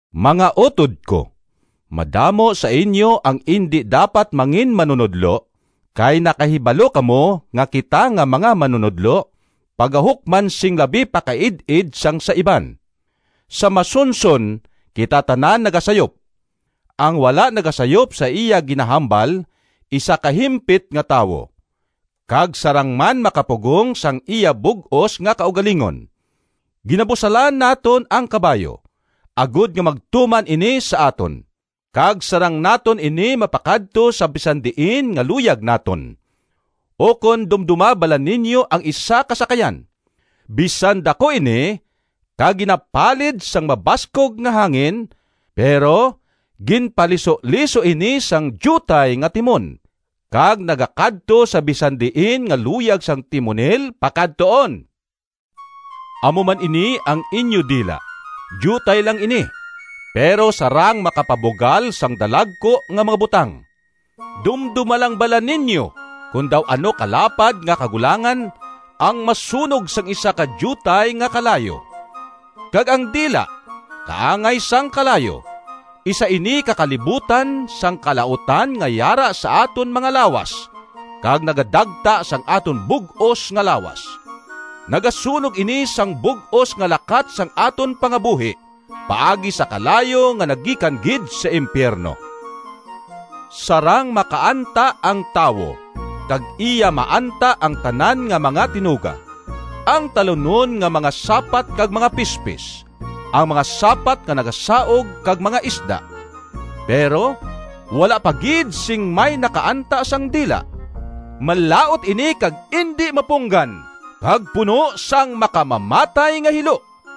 Mga utod ko! Madamo sa inyo ang indi dapat manginmanunodlo, kay nakahibalo kamo nga kita nga mga manunodlo pagahukman sing labi pa kaid-id sang sa iban. Sa masunson kita tanan nagasayop. Ang wala nagasayop sa iya ginahambal isa ka himpit nga tawo, kag sarang man makapugong sang iya bug-os nga kaugalingon. Ginabusalan naton ang kabayo agod nga magtuman ini sa aton, kag sarang naton ini mapakadto sa bisan diin nga luyag naton. Ukon dumdoma bala ninyo ang isa ka sakayan: bisan daku ini, kag ginapalid sang mabaskog nga hangin, pero ginpalisuliso ini sang diutay nga timon, kag nagakadto sa bisan diin nga luyag sang timonil pakadtuon. Amo man ini ang inyo dila: diutay lang ini, pero sarang makapabugal sang dalagku nga mga butang. Dumdoma lang bala ninyo kon daw ano kalapad nga kagulangan ang masunog sang isa ka diutay nga kalayo. Kag ang dila kaangay sang kalayo. Isa ini ka kalibutan sang kalautan nga yara sa aton mga lawas kag nagadagta sang aton bug-os nga lawas. Nagasunog ini sang bug-os nga lakat sang aton pangabuhi paagi sa kalayo nga nagikan gid sa impiyerno. Sarang makaanta ang tawo kag iya maanta ang tanan nga mga tinuga: ang talunon nga mga sapat kag mga pispis, ang mga sapat nga nagasaug kag mga isda. Pero wala pa gid sing may nakaanta sang dila. Malaut ini kag indi mapunggan, kag puno sang makamamatay nga hilo!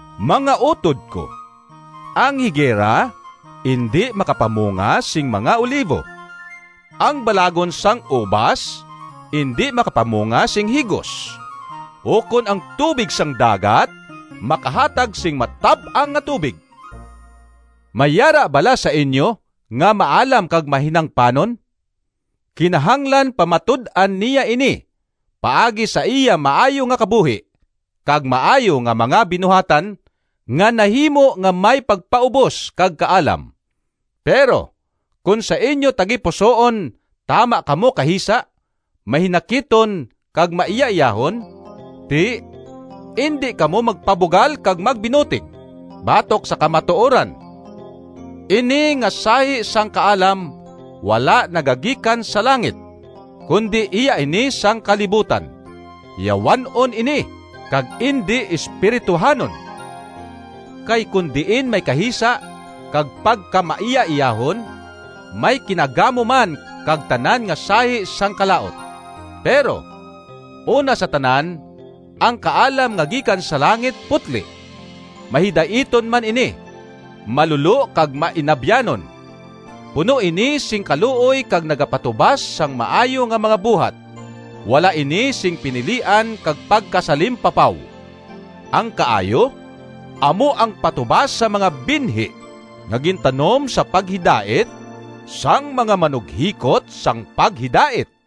Mga utod ko, ang higera indi makapamunga sing mga olivo, ang balagon sang ubas indi makapamunga sing higos, ukon ang tubig sang dagat makahatag sing matab-ang nga tubig. May yara bala sa inyo nga maalam kag mahinangpanon? Kinahanglan pamatud-an niya ini paagi sa iya maayo nga kabuhi, kag maayo nga mga binuhatan nga nahimo nga may pagpaubos kag kaalam. Pero kon sa inyo tagipusoon tama kamo kahisa, mahinakiton kag maiyaiyahon, ti indi kamo magpabugal kag magbinutig batok sa kamatuoran. Ini nga sahi sang kaalam wala nagagikan sa langit, kundi iya ini sang kalibutan. Yawan-on ini kag indi espirituhanon. Kay kon diin may kahisa kag pagkamaiyaiyahon, may kinagamo man kag tanan nga sahi sang kalaut. Pero una sa tanan, ang kaalam nga gikan sa langit putli. Mahidaiton man ini, malulo kag mainabyanon. Puno ini sing kaluoy kag nagapatubas sang maayo nga mga buhat. Wala ini sing pinilian kag pagkasalimpapaw. Ang kaayo amo ang patubas sang mga binhi nga gintanom sa paghidait sang mga manughikot sang paghidait.